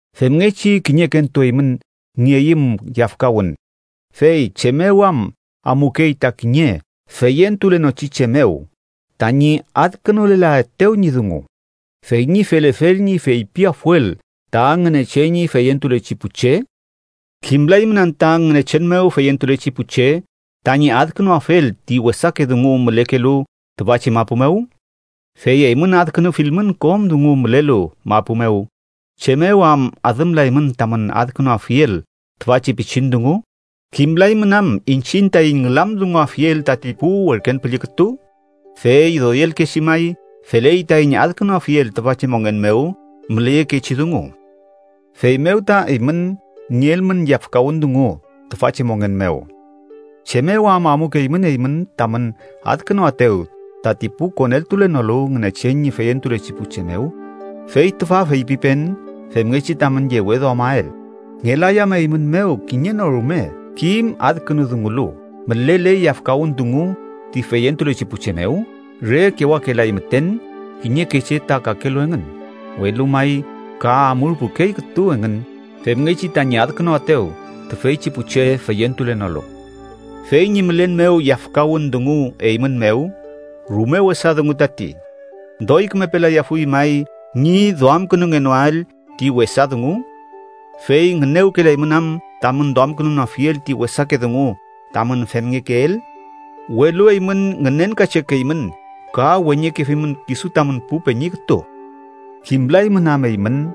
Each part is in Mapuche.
Femngechi kiñekentu eymün nieyüm yafkawün, ¿fey chem mew am amukey ta kiñe feyentulenochi che mew tañi adkünulelaetew ñi dungu, fey ñi felefel ñi feypiafuel ta Ngünechen ñi feyentulechi pu che? ¿Kimlaymün anta Ngünechen mew feyentulechi pu che tañi adkünuafel ti wesake dungu mülekelu tüfachi mapu mew? Fey eymün adkünuafilmün kom dungu mülelu mapu mew, ¿chem mew am adümlaymün tamün adkünuafiel tüfachi pichin dungu? ¿Kimlaymün am iñchiñ taiñ ngülamdunguafiel tati pu werken püllü kütu? Fey doykechi may feley taiñ adkünuafiel tüfachi mongen mew müleyekechi dungu. Feymew ta eymün nielmün yafkawün dungu tüfachi mongen mew, ¿chem mew am amukeymün eymün tamün adkünuaetew tati pu koneltulenolu Ngünechen ñi feyentulechi pu che mew? Fey tüfa feypipen femngechi tamün yeweduamael. ¿Ngelay am eymün mew kiñe no rume kim adkünudungulu mülele yafkawün dungu ti feyentulechi pu che mew? ¡Re kewakelay müten kiñeke che ta kakelu engün, welu may ka amurpukey kütu engün femngechi tañi adkünuaetew tüfeychi pu che feyentulenolu! Fey ñi mülen mew yafkawün dungu eymün mew, ¡rume wesa dungu tati! ¿Doy kümepelayafuy may ñi duamkünungenoael ti wesa dungu? ¿Fey ngünewkelaymün am tamün duamkünunoafiel ti wesake dungu tamün femngekeel? ¡Welu eymün ngünenkachekeymün ka weñekefimün kisu tamün pu peñi kütu! ¿Kimlaymün am eymün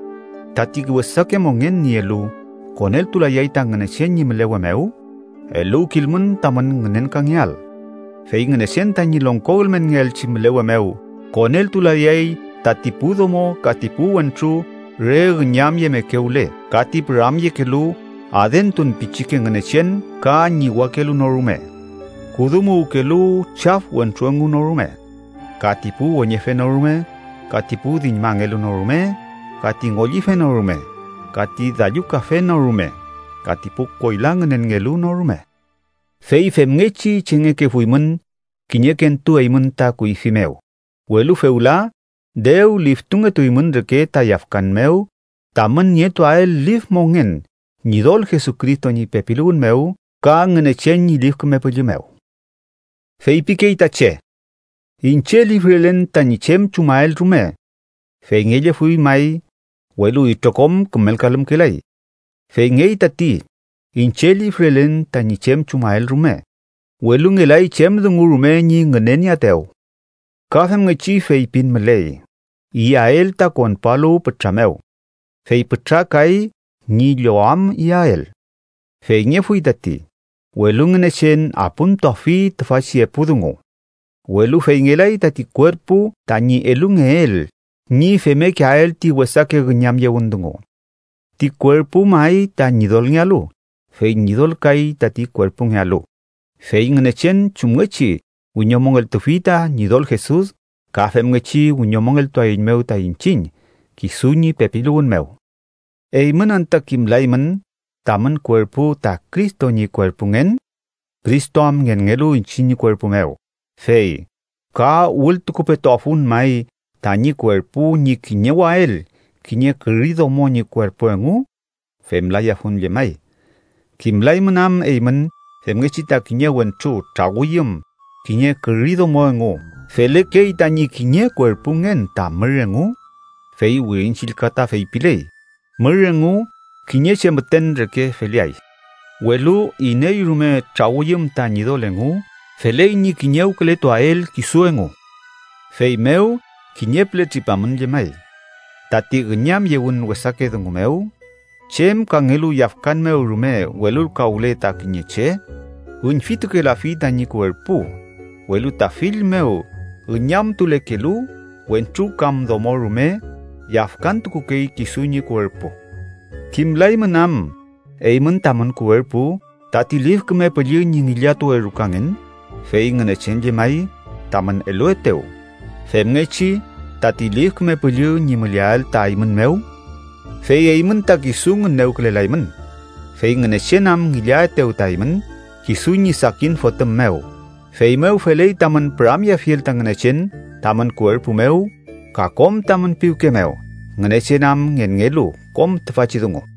tati wesake mongen nielu koneltulayay ta Ngünechen ñi mülewe mew? Eluwkilmün tamün ngünenkangeael. Fey Ngünechen tañi longko ülmenngeelchi mülewe mew koneltulayay tati pu domo ka ti pu wentru re üñamyemekewle ka ti püramyekelu adentun pichike ngünechen ka ñiwakelu no rume, kudumuwkelu chaf wentru engu no rume, ka ti pu weñefe no rume, ka ti pu diñmangelu no rume, ka ti ngollife no rume, ka ti dallukafe no rume, ka ti pu koyla ngünenngelu no rume. Fey femngechi chengekefuymün kiñekentu eymün ta kuyfi mew, welu fewla dew liftungetuymün reke ta yafkan mew tamün nietuael lif mongen Ñidol Jesucristo ñi pepiluwün mew ka Ngünechen ñi Lif Küme Püllü mew. Feypikey ta che: “Iñche lifrelen tañi chem chumael rume.” Feyngellefuy may, welu itrokom kümelkalümkelay. Feyngey tati. Iñche lifrelen tañi chem chumael rume, welu ngelay chem dungu rume ñi ngünenieaetew. Ka femngechi feypin müley: “Iyael ta konpualu pütra mew, fey pütra kay ñi llowam iyael.” Feyngefuy tati, welu Ngünechen apümtuafi tüfachi epu dungu. Welu feyngelay tati kuerpu tañi elungeel ñi femmekeael ti wesake üñamyewün dungu. Ti kuerpu may ta Ñidolngealu, fey Ñidol kay tati kuerpungealu. Fey Ngünechen chumngechi wiñomongeltufi ta Ñidol Jesus, ka femngechi wiñomongeltuaeiñmew ta iñchiñ kisu ñi pepiluwün mew. ¿Eymün anta kimlaymün tamün kuerpu ta Cristo ñi kuerpungen? Cristo am ngenngelu iñche ñi kuerpu mew, fey ¿ka wültukupetuafun may tañi kuerpu ñi kiñewael kiñe küri domo ñi kuerpu engu? ¡Femlayafun llemay! ¿Kimlaymün am eymün femngechi ta kiñe wentru trawüyüm kiñe küri domo engu, felekey tañi kiñe kuerpungen ta mür engu? Fey Wirin Chillka ta feypiley: “Mür engu kiñe che müten reke feleay.” Welu iney rume trawüyüm ta Ñidol engu, feley ñi kiñewkületuael kisu engu. Feymew kiñe püle tripamün llemay, tati üñamyewün wesake dungu mew, chem kangelu yafkan mew rume welulkawle ta kiñe che, üñfitukelafi tañi kuerpu, welu ta fill mew üñamtulekelu wentru kam domo rume yafkantukukey kisu ñi kuerpu. ¿Kimlaymün am eymün tamün kuerpu, tati Lif Küme Püllü ñi ngillatuwe rukangen, fey Ngünechen llemay tamün eluetew, femngechi tati Lif Küme Püllü ñi müleael ta eymün mew? Fey eymün ta kisu ngünewkülelaymün, fey Ngünechen am ngillaetew ta eymün, kisu ñi sakin Fotüm mew. Feymew feley tamün püramyeafiel ta Ngünechen tamün kuerpu mew ka kom tamün piwke mew, Ngünechen am ngenngelu kom tüfachi dungu.